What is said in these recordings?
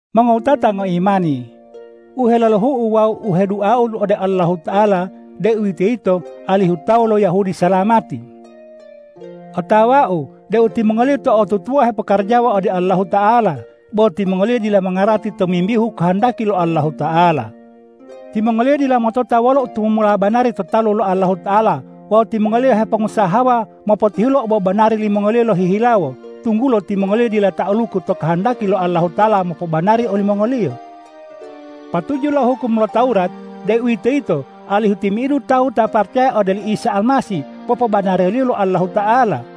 Mongowutata ngoimani, u heololu'u wawu u heduau ode Allahuta'ala, deuwitoyito alihu tawu lo Yahudi salamati. Otawau deu timongoliyo to'otutuwa hepokarajawa ode Allahuta'ala, bo timongoliyo dila mongarati tomimbihu kohondaki lo Allahuta'ala. Timongoliyo dila motota wololo tumumula banari to talu lo Allahuta'ala wawu timongoliyo bo hepongusahawa mopotihulo obobanari limongoliyo lohihilawo, tunggulo timongoliyo dila ta'aluku to kohondaki lo Allahuta'ala mopobanari olimongoliyo. Patuju lo hukum lo Tawurat, deuwitoyito alihu timi'idu tawu ta paracaya ode oli Isa Almasih, popobanariyo lo Allahuta'ala.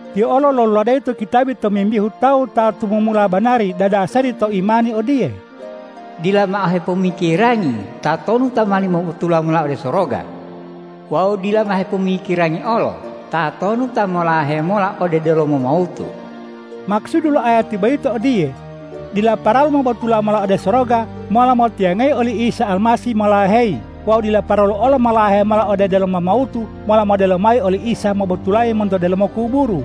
Tiyo olo loluladeyi to kitabi tomimbihu tawu ta tumumula banari dadasari to imani odiye,”Dila mao hepomikirangi tatonu ta mowali mobotula mola ode soroga wawu dila mao hepomikirangi olo tatonu ta molahe mola ode delomo mawutu.” Makusudu lo ayati boyito odiye: Dila paralu mobotula mola ode soroga mola motiyangayi oli Isa Almasih molaheyi wawu dila paralu olo molahe mola ode delomo mawutu mola modelo mayi oli Isa mobotulayi monto delomo kuburu.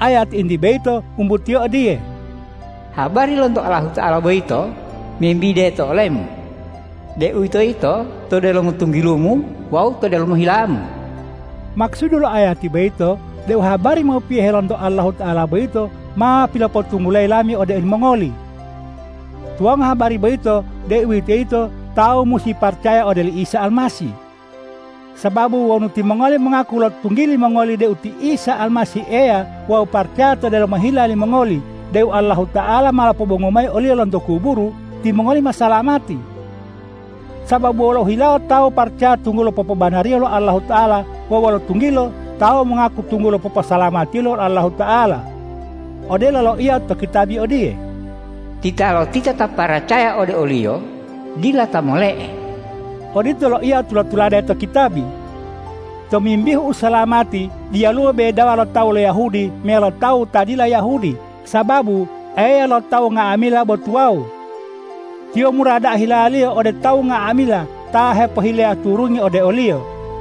Ayati entiye boyito o wumbutiyo odiye,”Habari lonto Allahuta'ala boyito membide to olemu, deuwitoyito to delomo tunggilumu wawu to delomo hilamu.” Makusudu lo ayati boyito deu habari mopiyohe lonto Allahuta'ala boyito ma pilopotunggulayi lami ode olimongoli. Tuwango habari boyito, deuwitoyito tawu musi paracaya ode oli Isa Almasih. Sababu wonu timongoli mongaku lo tunggili mongoli deu ti Isa Almasih Eya wawu paracaya to delomo hila limongoli deu Allahuta'ala ma lopobongu mayi o-Liyo lonto kuburu, timongoli ma salamati. Sababu wolo hilawo tawu paracaya tunggulo popobanariyo lo Allahuta'ala wawu wolo tunggilo tawu mongaku tunggulo poposalamatiyo lo Allahuta'ala. Odelo loiya to kitabi odiye,”Titalotita ta paracaya ode o-Liyo, dila ta mole'e.” Odito loiya tula-tulade to kitabi. Tomimbihu usalamati diyaluwo bedawa lo tawu lo Yahudi meyalo tawu ta dila Yahudi, sababu Eya lo tawu nga'amila bo tuwawu. Tiyo mura da'a hila-Liyo ode tawu nga'amila ta hepohileya turungi ode o-Liyo.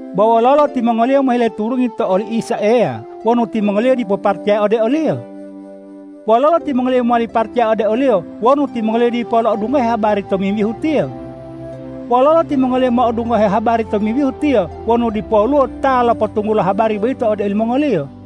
Bo wololo timongoliyo mohile turungi to oli Isa Eya wonu timongoliyo dipo paracaya ode o-Liyo? Wololo timongoliyo mowali paracaya ode o-Liyo wonu timongoliyo dipo lo'odungohe habari tomimbihu Tiyo? Wololo timongoliyo mo'odungohe habari tomimbihu Tiyo wonu dipoluwo ta lopotunggulo habari boyito ode olimongoliyo?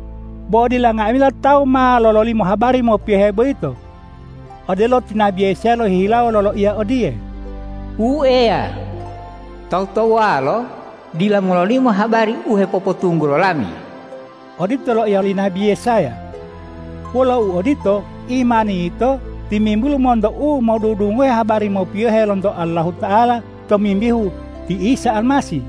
Bo dila nga'amila tawu ma lololimo habari mopiyohe boyito. Odelo ti nabi Yesaya lohihilawo loloiya odiye,”Wu Eya, tawu-tawuwalo dila mololimo habari u hepopotunggulo lami.” Odito loiya li nabi Yesaya. Wolo uodito, imani yito timimbulu monto u modudungohe habari mopiyohe lonto Allahuta'ala tomimbihu ti Isa Almasih.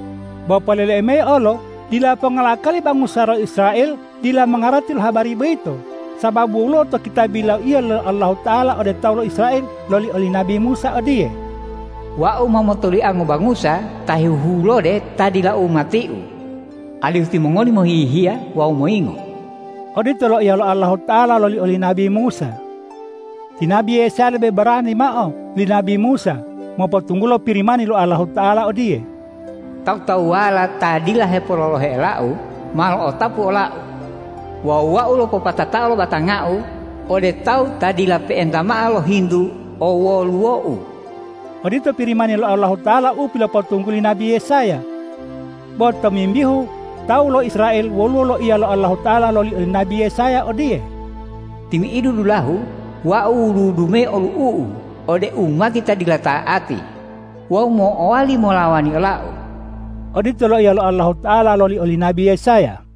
Bo poleleu mayi olo: Dila ponga lo akali bangusa lo Israel dila mongarati lo habari boyito, sababu woluwo to kitabi loiya lo Allahuta'ala ode tawu lo Israel loli oli nabi Musa odiye,”Wau ma motoliango bangusa ta hehulode ta dila umati-U, alihu timongoli mohihiya wawu moyingo.” Odito loiya lo Allahuta'ala loli oli nabi Musa. Ti nabi Yesaya lebe barani mao li nabi Musa mopotunggulo Pirimani lo Allahuta'ala odiye,”Tawu-tawuwala ta dila hepololohe ola-U ma lo'otapu ola-U wawu Wau lopopatatao lo batanga-U ode tawu ta dila pe'enta mao lohintu owoluwo-U.” Odito Pirimani lo Allahuta'ala u pilopotungguli nabi Yesaya. Bo tomimbihu tawu lo Israel woluwo loiya lo Allahuta'ala loli oli nabi Yesaya odiye,”Timi'idu dulahu Wau wudu-wudu mayi olu'u-U ode umati ta dila ta'ati wawu mo'owali molawani ola-U.” Odito loiya lo Allahuta'ala loli oli nabi Yesaya.